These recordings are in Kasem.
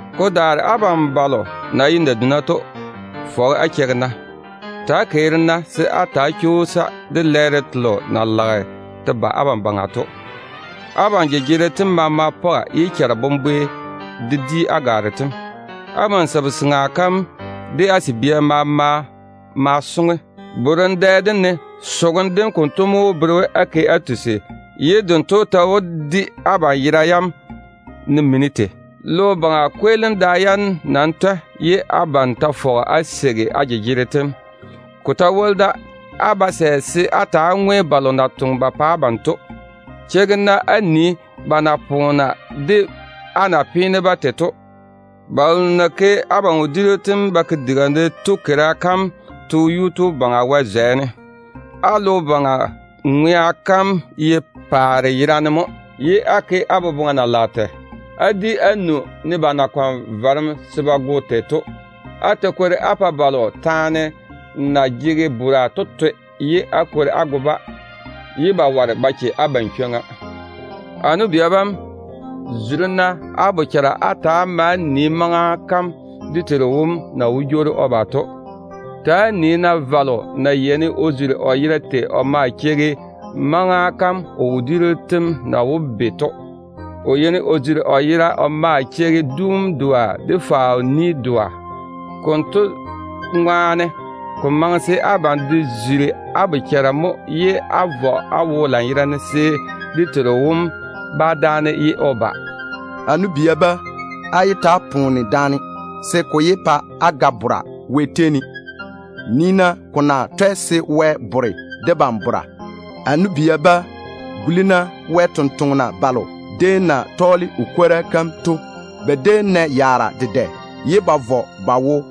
Ko daare abam balo na ye naduna to, fɔge á cheigi-na. Ta‑á keeri-na se á ta‑á chwoosa de lɛɛro telo na lage te ba abam baŋa to. Abam jejegero tem maama pɔga, ye charebombore de di á gwaaro tem. Abam sabu-seŋa kam de á sabia maama maa soŋe. Bora borem dɛ dem ne te soŋem dem konto mo wó bere we á ke á tusi, ye dento ta wó di abam yera yam ne mini tei. Logo baŋa kweelim da yam nam twɛ, ye abam ta fɔge á la á jejegero tem á tiŋi. Ko ta woli da, á ba sɛ se á ta‑á ŋwe balo na toŋe ba pa abam to. Cheigi-na á nii ba na poona de á na pini-ba tei to. Balo na ke abam wodiiru tem ba ke diga ne to keira kam to Yuu-tu Baŋa Wɛ zwɛ ne. Á logo baŋa ŋwea kam ye paare yerane mo, ye á ke á boboŋa na lage tei. Á di á nu, ne ba na kɔne varem se ba go tei to. Á ta kwori á pae balo na jege chega to ga bora, á daare á go-ba, ye ba ware á yiga se ba che. A nu-bia bam, zuri-na á bochara á ta‑á maa nii maŋa kam dé Teiru wom na wó jwoori o ba to. Ta‑á nii-na valo na yeini o zuri o yera tei o maa cheigi maŋa kam o wodiiru tem na wó be to. O yeini o zuri o yera o maa cheigi duum doa, de faao-ni doa. Konto ŋwaane, ko maŋe se abam de zuri á bochara mo ye á vɔ á wo lanyerane, se dé Teiru wom bá dáane ye o ba. A nu-bia bam, yé ta‑á poone daane, se ko wó pa á ga bora Wɛ tei ne. Nii-na, ko twɛ ko ti se Wɛ di debam taane. A nu-bia bam, guli-na Baŋa Wɛ sampwori selo déem na tɔɔle o kwora kam to gula. Ba déem nɛ yaara dedɛ ye ba vɔ ba wo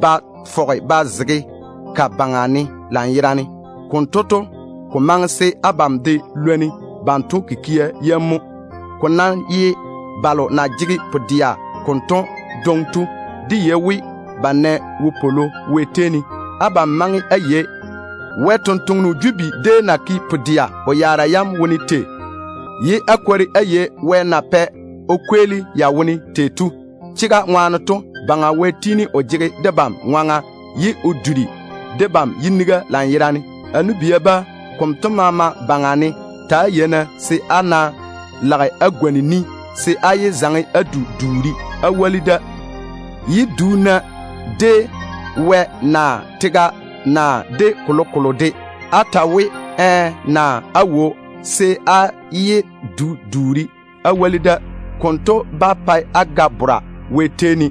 ba fɔge ba zege ka baŋa ne lanyerane. Konto to, ko maŋe se abam de lwoni banto kikia yam mo. Ko ná ye balo na jege pu-dɛa kanto dwoŋi to, dé yei we ba nɛ wopwolo Wɛ tei ne. Abam maŋe á yei Job déem na ke pu-dɛa o yaara yam wone tei, ye á kwori á yei Wɛ na pɛ o kweeli ya wone tei to. Chega ŋwaane to, Baŋa Wɛ tiini o jege debam ŋwaŋa ye o duri debam yibwona lanyerane. A nu-bia bam, konto maama baŋa ne, ta‑á yei-na se, á ná lage á gwoni ni, se á yé zaŋe á du duuri á woli da. Yé du-na de Wɛ, naa tega, naa de kolokolo de. Á nam wó ta we, “ɛɛ” naa “aawo”, se á yé du duuri á woli da. Ko ná dae konto, á wó ga bora Wɛ tei ne.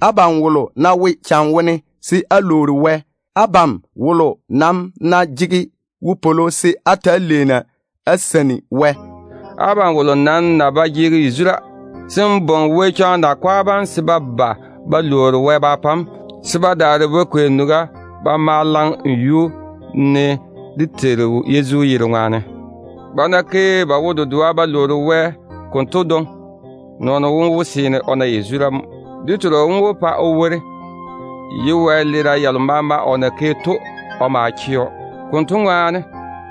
Abam wolo ná wo cham wone, se kotu lwoori Wɛ. Abam wolo nam ná jege wopwolo, se kotu taa leeni o seini Wɛ. Abam wolo nam ná ba jege yazura, se o bwoŋi Yezu kɔgɔ kom nakwa bam se ba ba ba lwoori Wɛ ba pa‑o, se ba daare ba kwei nuga ba ke o yuu ne dé Teiru Yezu yere ŋwaane. Ba ná ke ba wo-dedoa ba lwoori Wɛ konto dwoŋi, jaweeno wom wó seene o na yazura mo. Dé Teiru wom wó pa o wori, ye wɛleera yalo maama o na ke to Wɛ wó yage o ma chɛ‑o. Konto ŋwaane,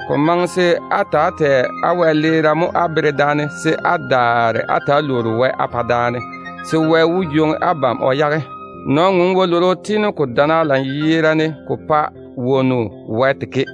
ko maŋe se á ta‑á tɛ á wɛleera taane jaja mo á bere daane, se á daare á ta‑á lwoori Wɛ á pa daane, se Wɛ wó pa á na yazura. Nɔn-ŋom wɛ-lworo tiini ko dana lanyerane ko wae ko pae wonnu ke.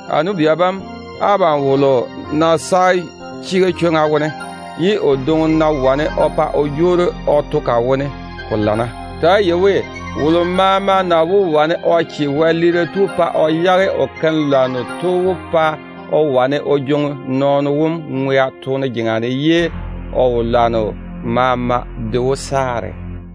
A nu-bia bam, abam wolo ná ywori chega chwoŋa kam wone, ye o dwoŋi ná wane o pa o jwoori o to ka wone, ko lana. Á nam ta‑á yei we, wolo maama ná wane o che wɛle-keiru pa o yage o tusim dem, kotu wó wane o vere nɔɔno wom toone jeŋa ne, ye o wɛleera maama de wó saare.